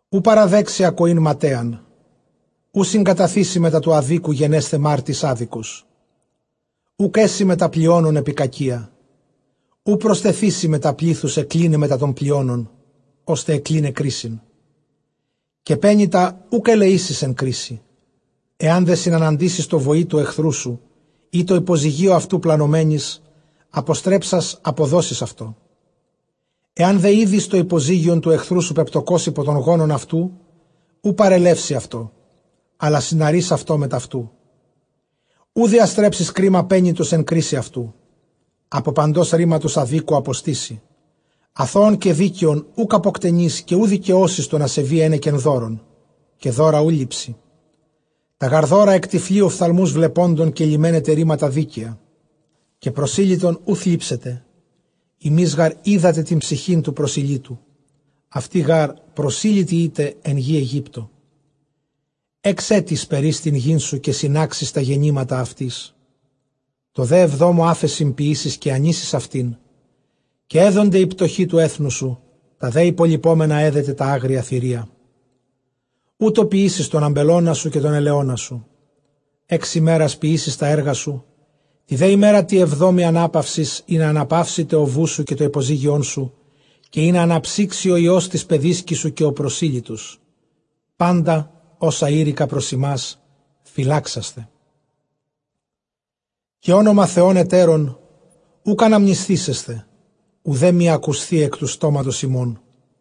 Οὐ παραδέξῃ ἀκοὴν ματαίαν· οὐ συγκαταθήσῃ μετὰ τοῦ ἀδίκου γενέσθαι μάρτυς ἄδικος. Οὐκ ἔσῃ μετὰ πλειόνων ἐπὶ κακίᾳ· οὐ προστεθήσῃ μετὰ πλήθους ἐκκλῖναι μετὰ τῶν πλειόνων, ὥστε ἑκκλεῖσαι κρίσιν. Καὶ πένητα οὐκ ἐλεήσεις ἐν κρίσει. Ἐὰν δὲ συναντήσῃς τῷ βοῒ τοῦ ἐχθροῦ σου, ἢ τῷ ὑποζυγίῳ αὐτοῦ πλανωμένοις, ἀποστρέψας ἀποδώσεις αὐτῷ. Ἐὰν δὲ ἴδῃς τὸ ὑποζύγιον τοῦ ἐχθροῦ σου πεπτωκὸς ὑπὸ τὸν γόμον αὐτοῦ, οὐ παρελεύσῃ αὐτὸ, ἀλλὰ συναρεῖς αὐτὸ μετʼ αὐτοῦ. Οὐ διαστρέψεις κρίμα πένητος ἐν κρίσει αὐτοῦ. Ἀπὸ παντὸς ῥήματος ἀδίκου ἀποστήσῃ· ἀθῷον καὶ δίκαιον οὐκ ἀποκτενεῖς· καὶ οὐ δικαιώσεις τὸν ἀσεβῆ ἕνεκεν δώρων. Καὶ δῶρα οὐ λήψῃ· τὰ γὰρ δῶρα ἐκτυφλοῖ ὀφθαλμοὺς βλεπόντων, καὶ λυμαῖνεται ῥήματα δίκαια. Καὶ προσήλυτον οὐ θλίψετε· ὑμεῖς γὰρ οἴδατε τὴν ψυχὴν τοῦ προσηλύτου· αὐτοὶ γὰρ προσήλυτοι ἦτε ἐν γῇ Αἰγύπτῳ. Ἓξ ἔτη σπερεῖς τὴν γῆν σου, καὶ συνάξεις τὰ γεννήματα αὐτῆς. Τῷ δὲ ἑβδόμῳ ἄφεσιν ποιήσεις, καὶ ἀνήσεις αὐτὴν, καὶ ἔδονται οἱ πτωχοὶ τοῦ ἔθνους σου· τὰ δὲ ὑπολειπόμενα ἔδεται τὰ ἄγρια θηρία· οὕτως ποιήσεις τὸν ἀμπελῶνά σου, καὶ τὸν ἐλαιῶνά σου. Ἓξ ἡμέρας ποιήσεις τὰ ἔργα σου, τῇ δὲ ἡμέρᾳ τῇ ἑβδόμῃ, ἀνάπαυσις· ἵνα ἀναπαύσηται ὁ βοῦς σου, καὶ τὸ ὑποζύγιόν σου, καὶ ἵνα ἀναψύξῃ ὁ υἱὸς τῆς παιδίσκης σου καὶ ὁ προσήλυτος. Πάντα ὅσα εἴρηκα πρὸς ὑμᾶς, φυλάξασθε· καὶ ὄνομα θεῶν ἑτέρων οὐκ ἀναμνησθήσεσθε, οὐδὲ μὴ ἀκουσθῇ ἐκ τοῦ στόματος ὑμῶν.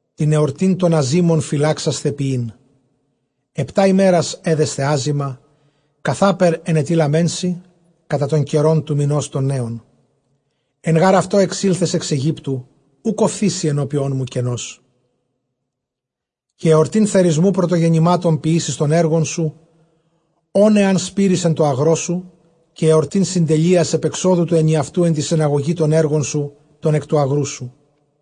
Τὴν ἑορτὴν τῶν ἀζύμων φυλάξασθε ποιεῖν· ἑπτὰ ἡμέρας ἔδεσθε ἄζυμα, καθάπερ ἐνετειλάμην σοι κατὰ τὸν καιρὸν τοῦ μηνὸς τῶν νέων· ἐν γὰρ αὐτῷ ἐξῆλθες ἐξ Αἰγύπτου· οὐκ ὀφθήσῃ ἐνώπίον μου κενός. Καὶ ἑορτὴν θερισμοῦ πρωτογεννημάτων ποιήσεις τῶν ἔργων σου, ὧν ἐὰν σπείρῃς ἐν τῷ ἀγρῷ σου, καὶ ἑορτὴν συντελείας ἐπʼ ἐξόδου τοῦ ἐνιαυτοῦ ἐν τῇ συναγωγῇ τῶν ἔργων σου τῶν ἐκ τοῦ ἀγροῦ σου.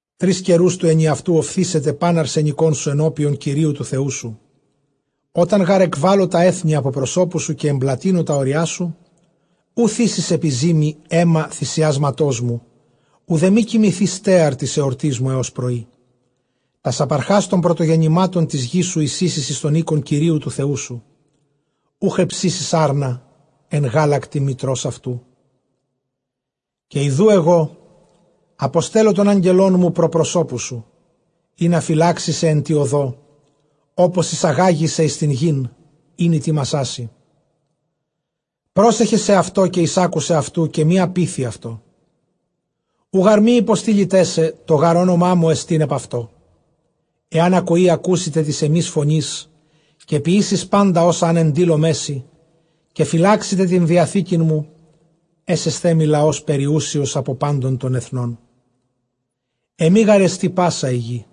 Τρεῖς καιροὺς τοῦ ἐνιαυτοῦ ὀφθήσεται πᾶν ἀρσενικόν σου ἐνώπιον Κυρίου τοῦ Θεοῦ σου. Ὅταν γὰρ ἐκβάλω τὰ ἔθνη ἀπὸ προσώπου σου, καὶ ἐμπλατύνω τὰ ὅριά σου, οὐ θύσεις ἐπὶ ζύμῃ αἷμα θυμιάματός μου, οὐδὲ μὴ κοιμηθῇ στέαρ τῆς ἑορτῆς μου ἕως πρωΐ. Τὰς ἀπαρχὰς τῶν πρωτογενημάτων τῆς γνς σου εἰσοίσεις εἰς τὸν οἶκον Κυρίου τοῦ Θεοῦ σου· οὐχ ἑψήσεις ἄρνα ἐν γάλακτι μητρὸς αὐτοῦ. Καὶ ἰδοὺ ἐγὼ ἀποστέλλω τὸν ἄγγελόν μου πρὸ προσώπου σου, ἵνα φυλάξῃ σε ἐν τῇ ὁδῷ, ὅπως εἰσαγάγῃ σε εἰς τὴν γῆν, ἣν ἡτοίμασά σοι. Πρόσεχε σεαυτῷ, καὶ εἰσάκουε αὐτοῦ, καὶ μὴ ἀπείθει αὐτῷ, οὐ γὰρ μὴ ὑποστείληταί σε· τὸ γὰρ ὄνομά μου ἐστὶν ἐπʼ αὐτῷ. Ἐὰν ἀκοῇ ἀκούσητε τῆς ἐμῆς φωνῆς, καὶ ποιήσῃς πάντα ὅσα ἂν ἐντείλωμαί σοι, καὶ φυλάξητε τὴν διαθήκην μου, ἔσεσθέ μοι λαὸς περιούσιος ἀπὸ πάντων τῶν ἐθνῶν· ἐμὴ γάρ ἐστι πᾶσα ἡ γῆ·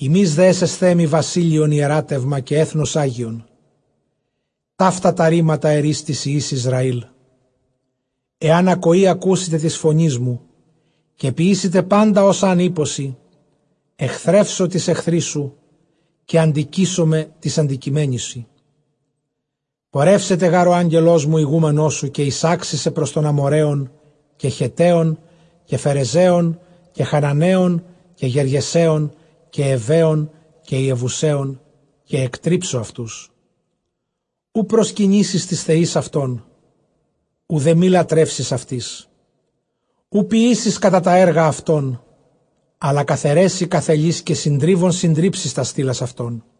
ὑμεῖς δὲ ἔσεσθέ μοι βασίλειον ἱεράτευμα, καὶ ἔθνος ἅγιον· ταῦτα τὰ ῥήματα ἐρεῖς τοῖς υἱοῖς Ἰσραὴλ, ἐὰν ἀκοῇ ἀκούσητε τῆς φωνῆς μου, καὶ ποιήσητε πάντα ὅσα ἂν εἴπω σοι, ἐχθρεύσω τοῖς ἐχθροῖς σου, καὶ ἀντικείσομαι τοῖς ἀντικειμένοις σοι. Πορεύσεται γὰρ ὁ ἄγγελός μου ἡγούμενός σου, καὶ εἰσάξει σε πρὸς τὸν Ἀμοῤῥαῖον, καὶ Χετταῖον, καὶ Φερεζαῖον, καὶ Χαναναῖον, καὶ Γεργεσαῖον, καὶ Εὑαῖον, καὶ Ἰεβουσαῖον, καὶ ἐκτρίψω αὐτούς. Οὐ προσκυνήσεις τοῖς θεοῖς αὐτῶν, οὐδὲ μὴ λατρεύσῃς αὐτοῖς· οὐ ποιήσεις κατὰ τὰ ἔργα αὐτῶν· ἀλλὰ καθαιρέσει καθελεῖς, καὶ συντρίβων συντρίψεις τὰς στήλας αὐτῶν.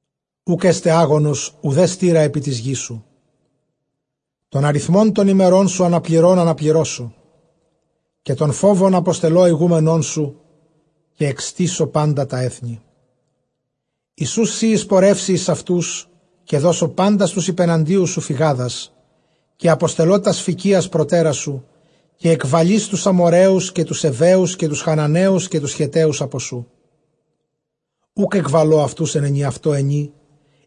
Οὐκ ἔσται ἄγονος, οὐδὲ στεῖρα ἐπὶ τῆς γῆς σου· τὸν ἀριθμὸν τῶν ἡμερῶν σου ἀναπληρῶν ἀναπληρώσω. Καὶ τὸν φόβον ἀποστελῶ ἡγούμενόν σου, καὶ ἐκστήσω πάντα τὰ ἔθνη, εἰς οὓς σὺ εἰσπορεύῃ εἰς αὐτούς· καὶ δώσω πάντας τοὺς ὑπεναντίους σου φυγάδας. Καὶ ἀποστελῶ τὰς σφηκίας προτέρας σου· καὶ ἐκβαλεῖς τοὺς Ἀμοῤῥαίους, καὶ τοὺς Εὑαίους, καὶ τοὺς Χαναναίους, καὶ τοὺς Χετταίους ἀπὸ σοῦ. Οὐκ ἐκβαλῶ αὐτοὺς ἐν ἐνιαυτῷ ἑνὶ,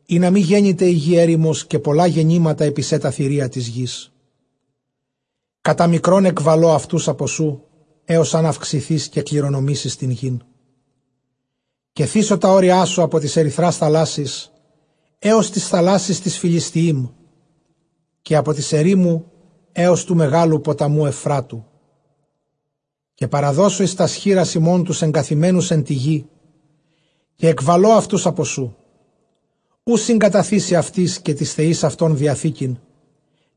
ἵνα μὴ γένηται ἡ γῆ ἔρημος, καὶ πολλὰ γένηται ἐπὶ σὲ τὰ θηρία τῆς γῆς. Κατὰ μικρὸν ἐκβαλῶ αὐτοὺς ἀπὸ σοῦ, ἕως ἂν αὐξηθῇς καὶ κληρονομήσῃς τὴν γῆν. Καὶ θήσω τὰ ὅριά σου ἀπὸ τῆς ἐρυθρᾶς θαλάσσης, ἕως τῆς θαλάσσης τῆς Φυλιστιείμ· καὶ ἀπὸ τῆς ἐρήμου, ἕως τοῦ μεγάλου ποταμοῦ Εὐφράτου· καὶ παραδώσω εἰς τὰς χεῖρας ὑμῶν τοὺς ἐγκαθημένους ἐν τῇ γῇ, καὶ ἐκβαλῶ αὐτοὺς ἀπὸ σοῦ. Οὐ συγκαταθήσῃ αὐτοῖς καὶ τοῖς θεοῖς αὐτῶν διαθήκην.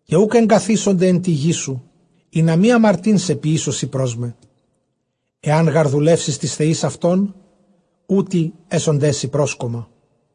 Καὶ οὐκ ἐνκαθήσονται ἐν τῇ γῇ σου, ἵνα μὴ ἁμαρτεῖν σε ποιήσωσι πρὸς μέ· ἐὰν γὰρ δουλεύσῃς τοῖς θεοῖς αὐτῶν, οὗτοι ἔσονταί σοι πρόσκομμα.